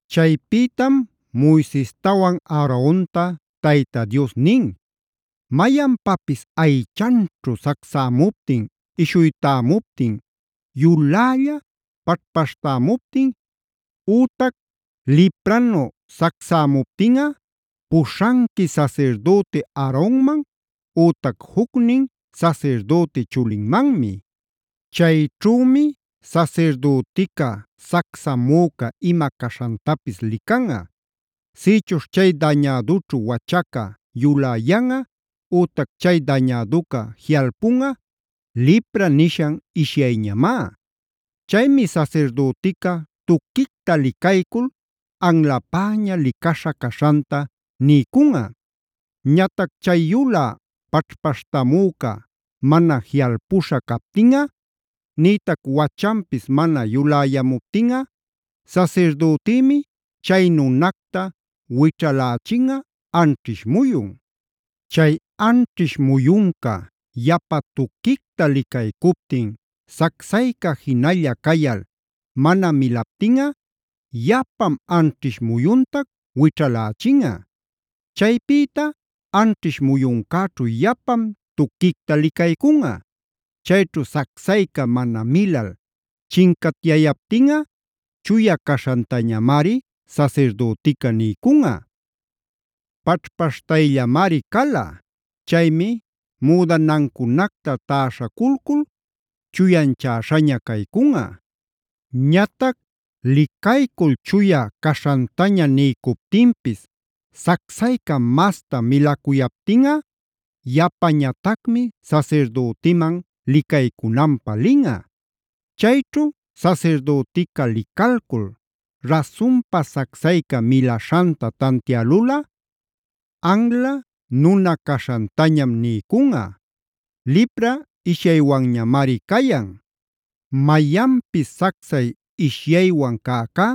Chaypïtam Moisestawan Aaronta Tayta Dios nin: “Mayanpapis aychanćhu sacsämuptin, ishuytämuptin, yulälla paćhpaśhtämuptin ütac lipranu sacsamuptinꞌa puśhanqui sasirdüti Aaronman ütac jucnin sasirdüti chulinmanmi. Chayćhümi sasirdütica sacsamüca ima caśhantapis licanꞌa. Sïchuśh chay dañädućhu wachaca yuläyanꞌa ütac chay dañäduca jiꞌalpunꞌa lipra nishan ishyayñamá. Chaymi sasirdütica tuquicta licaycul anlapäña licaśha caśhanta niycunꞌa. “Ñatac chay yulä paćhpaśhtämüca mana jiꞌalpuśha captinꞌa nïtac wachanpis mana yuläyamuptinꞌa sasirdütïmi chay nunacta wićhalächinꞌa anćhish muyun. Chay anćhish muyunca yapa tuquicta licaycuptin sacsayca jinalla cayal mana milaptinꞌa yapam anćhish muyuntac wićhalächinꞌa. Chaypïta anćhish muyuncäćhu yapam tuquicta licaycunꞌa. Chayćhu sacsayca mana milal chincatyayaptinꞌa chuya caśhantañamari sasirdütica niycunꞌa. Paćhpaśhtayllamari cala. Chaymi müdanancunacta täśhaculcul chuyanchäśhaña caycunꞌa. “Ñatac licaycul chuya caśhantaña niycuptinpis sacsayca masta milacuyaptinꞌa yapañatacmi sasirdütiman licaycunanpä linꞌa. Chayćhu sasirdütica licalcul rasunpa sacsayca milaśhanta tantiälulꞌa anla nuna caśhantañam niycunꞌa; lipra ishyaywanñamari cayan. “Mayanpis sacsay ishyaywan cäcá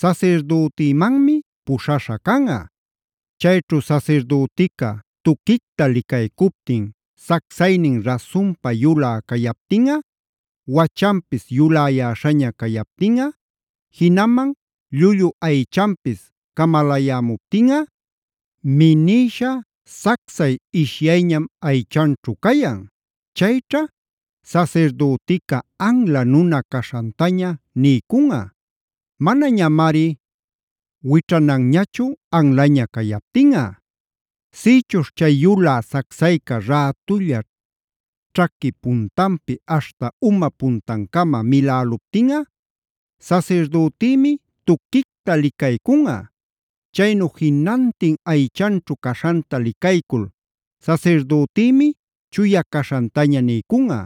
sasirdütimanmi puśhaśha canꞌa. Chayćhu sasirdütica tuquicta licaycuptin sacsaynin rasunpa yulä cayaptinꞌa, wachanpis yuläyäśhaña cayaptinꞌa, jinaman llullu aychanpis camalayämuptinꞌa, minïsha sacsay ishyayñam aychanćhu cayan. Chayćha sasirdütica anla nuna caśhantaña niycunꞌa; manañamari wićhananñachu anlaña cayaptinꞌa. “Sïchuśh chay yulä sacsayca rätulla ćhaqui puntanpi aśhta uma puntan-cama miläluptinꞌa, sasirdütïmi tuquicta licaycunꞌa. Chaynu jinantin aychanćhu caśhanta licaycul sasirdütïmi chuya caśhantaña niycunꞌa.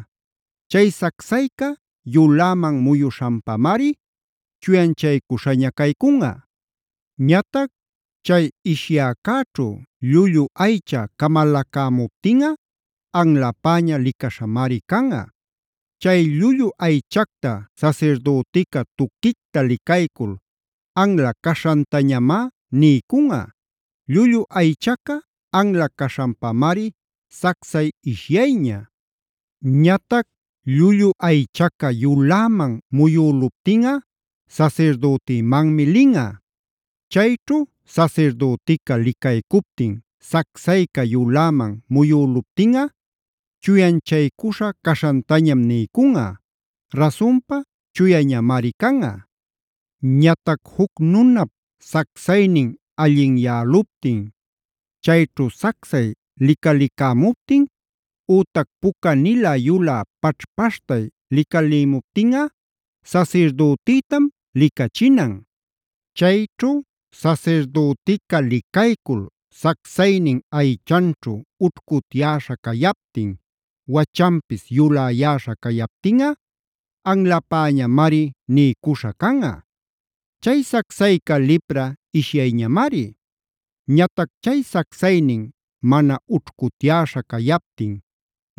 Chay sacsayca yuläman muyuśhanpamari chuyanchaycuśhaña caycunꞌa. Ñatac chay ishyäcäćhu llullu aycha camalacämuptinꞌa anlapäña licaśhamari canꞌa. Chay llullu aychacta sasirdütica tuquicta licaycul anla caśhantañamá niycunꞌa. Llullu aychaca anla caśhanpamari sacsay ishyayña. “Ñatac llullu aychaca yuläman muyüluptinꞌa sasirdütimanmi linꞌa. Chayćhu sasirdütica licaycuptin sacsayca yuläman muyüluptinꞌa chuyanchaycuśha caśhantañam niycunꞌa; rasunpa chuyañamari canꞌa. “Ñatac juc nunap sacsaynin allinyäluptin, chayćhu sacsay licalicämuptin ütac pucanilä yulä paćhpaśhtay licalïmuptinꞌa sasirdütitam licachinan. Chayćhu sasirdütica licaycul sacsaynin aychanćhu ućhcutyäśha cayaptin, wachanpis yulayäśha cayaptinꞌa anlapäñamari niycuśha canꞌa; chay sacsayca lipra ishyayñamari. Ñatac chay sacsaynin mana ućhcutyäśha cayaptin,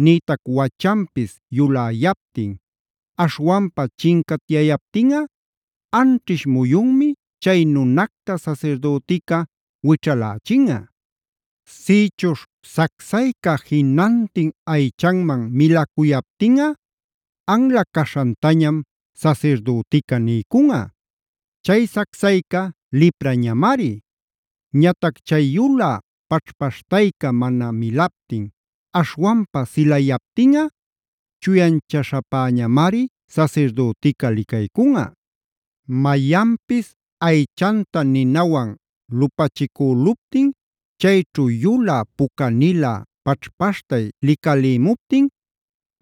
nïtac wachanpis yuläyaptin, aśhwanpa chincatyayaptinꞌa anćhish muyunmi chay nunacta sasirdütica wićhalächinꞌa. Sïchuśh sacsayca jinantin aychanman milacuyaptinꞌa anla caśhantañam sasirdütica niycunꞌa; chay sacsayca liprañamari. Ñatac chay yulä paćhpaśhtayca mana milaptin, aśhwanpa silayaptinꞌa chuyanchaśhapäñamari sasirdütica licaycunꞌa. “Mayanpis aychanta ninawan lupachicüluptin chayćhu yulä pucanilä paćhpaśhtay licalïmuptin,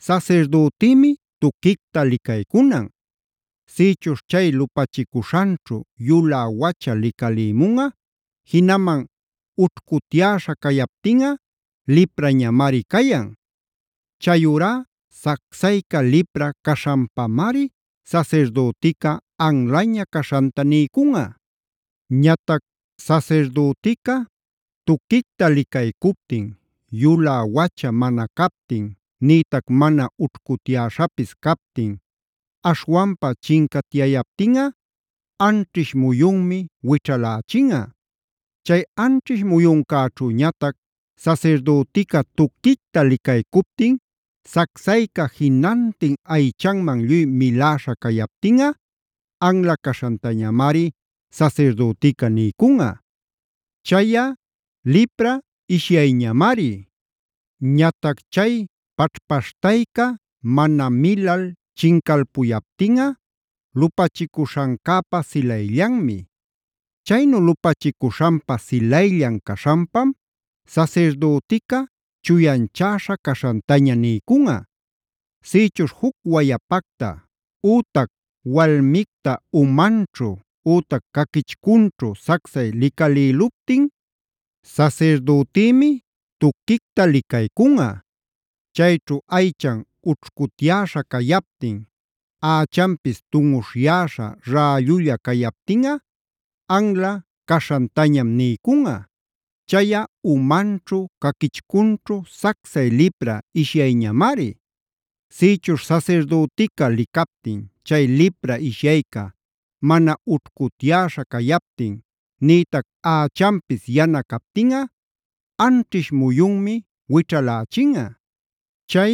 sasirdütïmi tuquicta licaycunan. Sïchuśh chay lupachicuśhanćhu yulä wacha licalïmunꞌa, jinaman ućhcutyäśha cayaptinꞌa liprañamari cayan. Chayurá sacsayca lipra caśhanpamari sasirdütica anlaña caśhanta niycunꞌa. Ñatac sasirdütica tuquicta licaycuptin yulä wacha mana captin, nïtac mana ućhcutyäśhapis captin, aśhwanpa chincatyayaptinꞌa anćhish muyunmi wićhalächinꞌa. Chay anćhish muyuncäćhuñatac sasirdütica tuquicta licaycuptin sacsayca jinantin aychanman lluy miläśha cayaptinꞌa anla caśhantañamari sasirdütica niycunꞌa; chayꞌa lipra ishyayñamari. Ñatac chay paćhpaśhtayca mana milal chincalpuyaptinꞌa lupachicuśhancäpa silayllanmi. Chaynu lupachicuśhanpa silayllan caśhanpam sasirdütica chuyanchäśha caśhantaña niycunꞌa. “Sïchuśh juc wayapacta ütac walmicta umanćhu ütac caquichcunćhu sacsay licalïluptin, sasirdütïmi tuquicta licaycunꞌa. Chayćhu aychan ućhcutyäśha cayaptin, ächanpis tunꞌuśhyäśha rällulla cayaptinꞌa anla caśhantañam niycunꞌa; chayꞌa umanćhu, caquichcunćhu sacsay lipra ishyayñamari. Sïchuśh sasirdütica licaptin chay lipra ishyayca mana ućhcutyäśha cayaptin, nïtac ächanpis yana captinꞌa anćhish muyunmi wićhalächinꞌa. Chay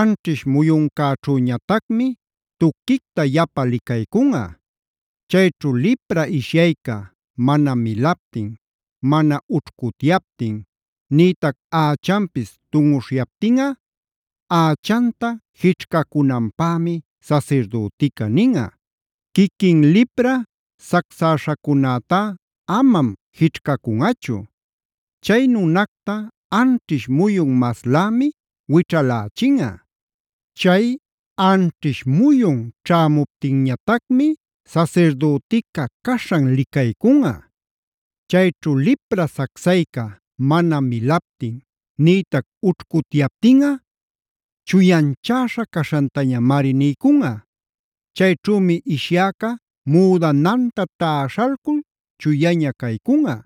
anćhish muyuncäćhüñatacmi tuquicta yapa licaycunꞌa. Chayćhu lipra ishyayca mana milaptin, mana ućhcutyaptin, nïtac ächanpis tunꞌuśhyaptinꞌa, ächanta jićhcacunanpämi sasirdütica ninꞌa; quiquin lipra sacsäśhacunätá amam jićhcacunꞌachu. Chay nunacta anćhish muyun maslämi wićhalächinꞌa. Chay anćhish muyun ćhämuptinñatacmi sasirdütica caśhan licaycunꞌa. Chayćhu lipra sacsayca mana milaptin nïtac ućhcutyaptinꞌa chuyanchäśha caśhantañamari niycunꞌa. Chayćhümi ishyäca müdananta täśhalcul chuyaña caycunꞌa.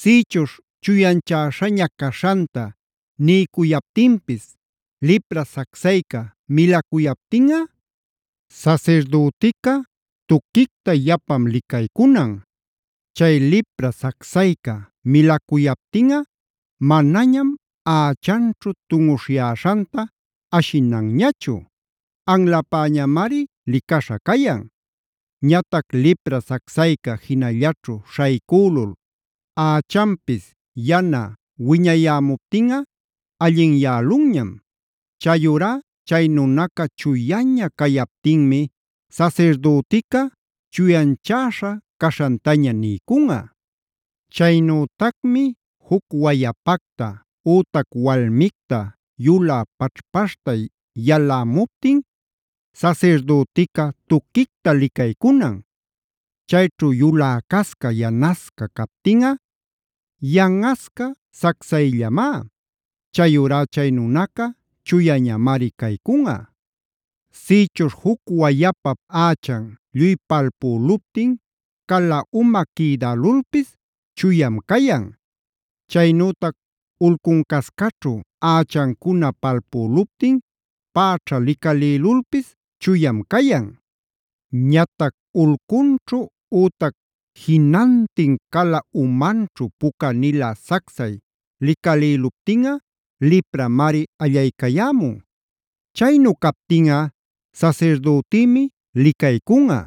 Sïchuśh chuyanchäśhaña caśhanta niycuyaptinpis lipra sacsayca milacuyaptinꞌa, sasirdütica tuquicta yapam licaycunan. Chay lipra sacsayca milacuyaptinꞌa manañam ächanćhu tunꞌuśhyäśhanta ashinanñachu; anlapäñamari licaśha cayan. Ñatac lipra sacsayca jinallaćhu śhaycülul ächanpis yana wiñayämuptinꞌa allinyälunñam. Chayurá chay nunaca chuyaña cayaptinmi sasirdütica chuyanchäśha caśhantaña niycunꞌa. “Chaynütacmi juc wayapacta ütac walmicta yulä paćhpaśhtay yalämuptin, sasirdütica tuquicta licaycunan. Chayćhu yuläcasca, yanasca captinꞌa yanꞌasca sacsayllamá; chayurá chay nunaca chuyañamari caycunꞌa. “Sïchuśh juc wayapap ächan lluy palpüluptin cala uma quïdalulpis chuyam cayan. Chaynütac ulcuncascaćhu ächancuna palpüluptin päćha licalïlulpis chuyam cayan. Ñatac ulcunćhu ütac jinantin cala umanćhu pucanilä sacsay licalïluptinꞌa lipramari allaycayämun. Chaynu captinꞌa sasirdütïmi licaycunꞌa.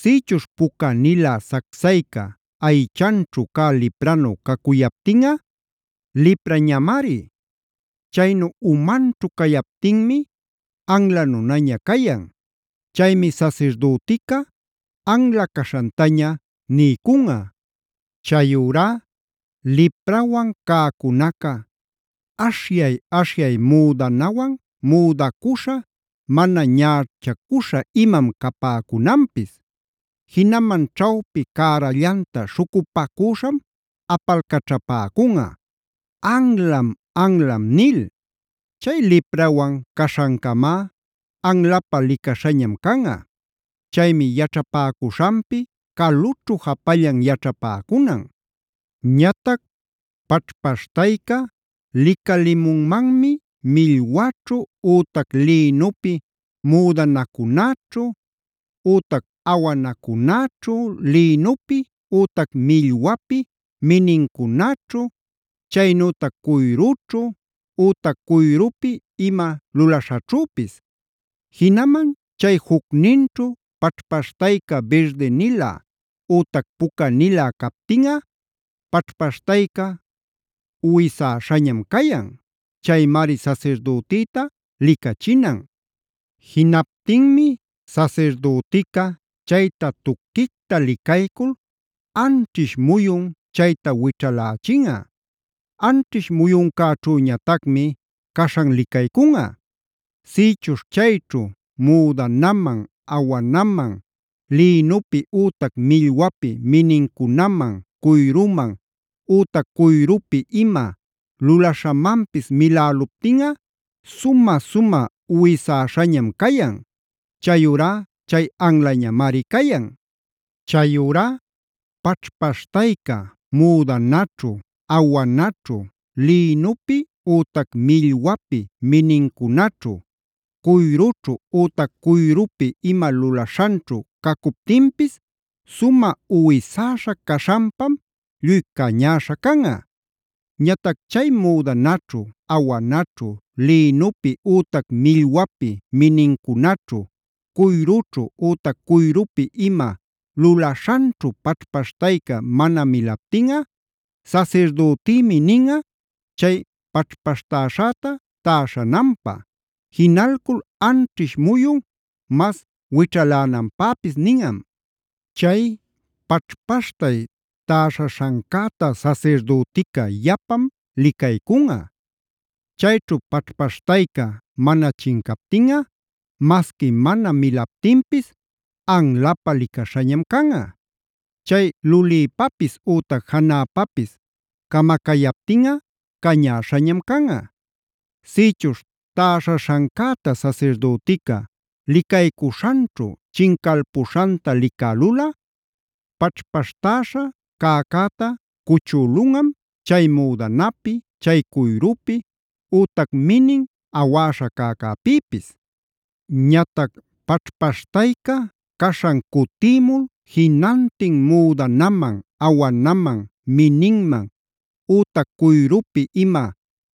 Sïchuśh pucanilä sacsayca aychanćhu cä lipranu cacuyaptinꞌa, liprañamari. Chaynu umanćhu cayaptinmi anla nunaña cayan. Chaymi sasirdütica anla caśhantaña niycunꞌa. “Chayurá liprawan cäcunaca aśhyay-aśhyay müdanawan müdacuśha, mana ñächacuśha imam capäcunanpis. Jinaman ćhawpi cärallanta śhucupacüśham apalcachapäcunꞌa: ‘¡Anlam! ¡Anlam!’ nil. Chay liprawan caśhancamá anlapä licaśhañam canꞌa. Chaymi yaćhapäcuśhanpi calućhu japallan yaćhapäcunan. “Ñatac paćhpaśhtayca licalimunman millwaćhu ütac lïnupi müdanacunaćhu, ütac awanacunaćhu, lïnupi ütac millwapi minincunaćhu, chaynütac cuyrućhu ütac cuyrupi ima luläśhaćhüpis. Jinaman chay jucninćhu paćhpaśhtayca birdinilä ütac pucanilä captinꞌa paćhpaśhtayca uwisäśhañam cayan. Chaymari sasirdütïta licachinan. Jinaptinmi sasirdütica chayta tuquicta licaycul anchiśh muyun chayta wićhalächinꞌa. Anćhish muyuncäćhüñatacmi caśhan licaycunꞌa. Sïchuśh chayćhu müdanaman, awanaman, lïnupi ütac millwapi minincunaman, cuyruman ütac cuyrupi ima lulaśhamanpis miläluptinꞌa sumä-sumä uwisäśhañam cayan; chayurá chay anlañamari cayan. Chayurá paćhpaśhtayca müdanaćhu, awanaćhu, lïnupi ütac millwapi minincunaćhu, cuyrućhu ütac cuyrupi ima lulaśhanćhu cacuptinpis sumä uwisäśha caśhanpam lluy cañäśha canꞌa. Ñatac chay müdanaćhu, awanaćhu, lïnupi ütac millwapi minincunaćhu, cuyrućhu ütac cuyrupi ima lulaśhanćhu paćhpaśhtayca mana milaptinꞌa, sasirdütïmi ninꞌa, chay paćhpaśhtäśhäta täśhananpä. Jinalcul anćhish muyun mas wićhalänanpäpis ninꞌam. “Chay paćhpaśhtay täśhaśhancäta sasirdütica yapam licaycunꞌa. Chayćhu paćhpaśhtayca mana chincaptinꞌa, masqui mana milaptinpis anlapä licaśhañam canꞌa. Chay lulïpapis ütac janäpapis camacayaptinꞌa cañäśhañam canꞌa. Sïchuśh täśhaśhancäta sasirdütica licaycuśhanćhu chincalpuśhanta licälulꞌa paćhpaśhtäśha cäcäta cuchülunꞌam chay müdanapïta, chay cuyrupïta ütac minin awäśha cäcäpïpis. Ñatac paćhpaśhtayca caśhan cutïmul jinantin müdanaman, awanaman, mininman, ütac cuyrupi ima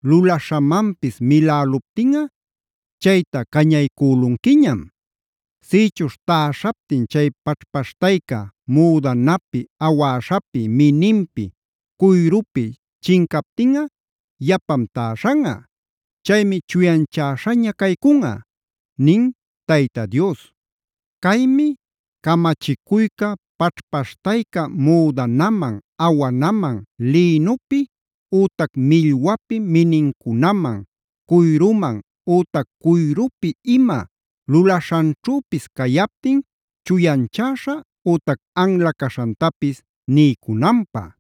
lulaśhamanpis miläluptinꞌa chayta cañaycülunquiñam. Sïchuśh täśhaptin chay paćhpaśhtayca müdanapi, awäśhapi, mininpi, cuyrupi chincaptinꞌa yapam täśhanꞌa. Chaymi chuyanchäśhaña caycunꞌa” nin Tayta Dios. Caymi camachicuyca paćhpaśhtayca müdanaman, awanaman, lïnupi ütac millwapi minincunaman, cuyruman ütac cuyrupi ima lulaśhanćhüpis cayaptin chuyanchäśha ütac anla caśhantapis niycunanpä.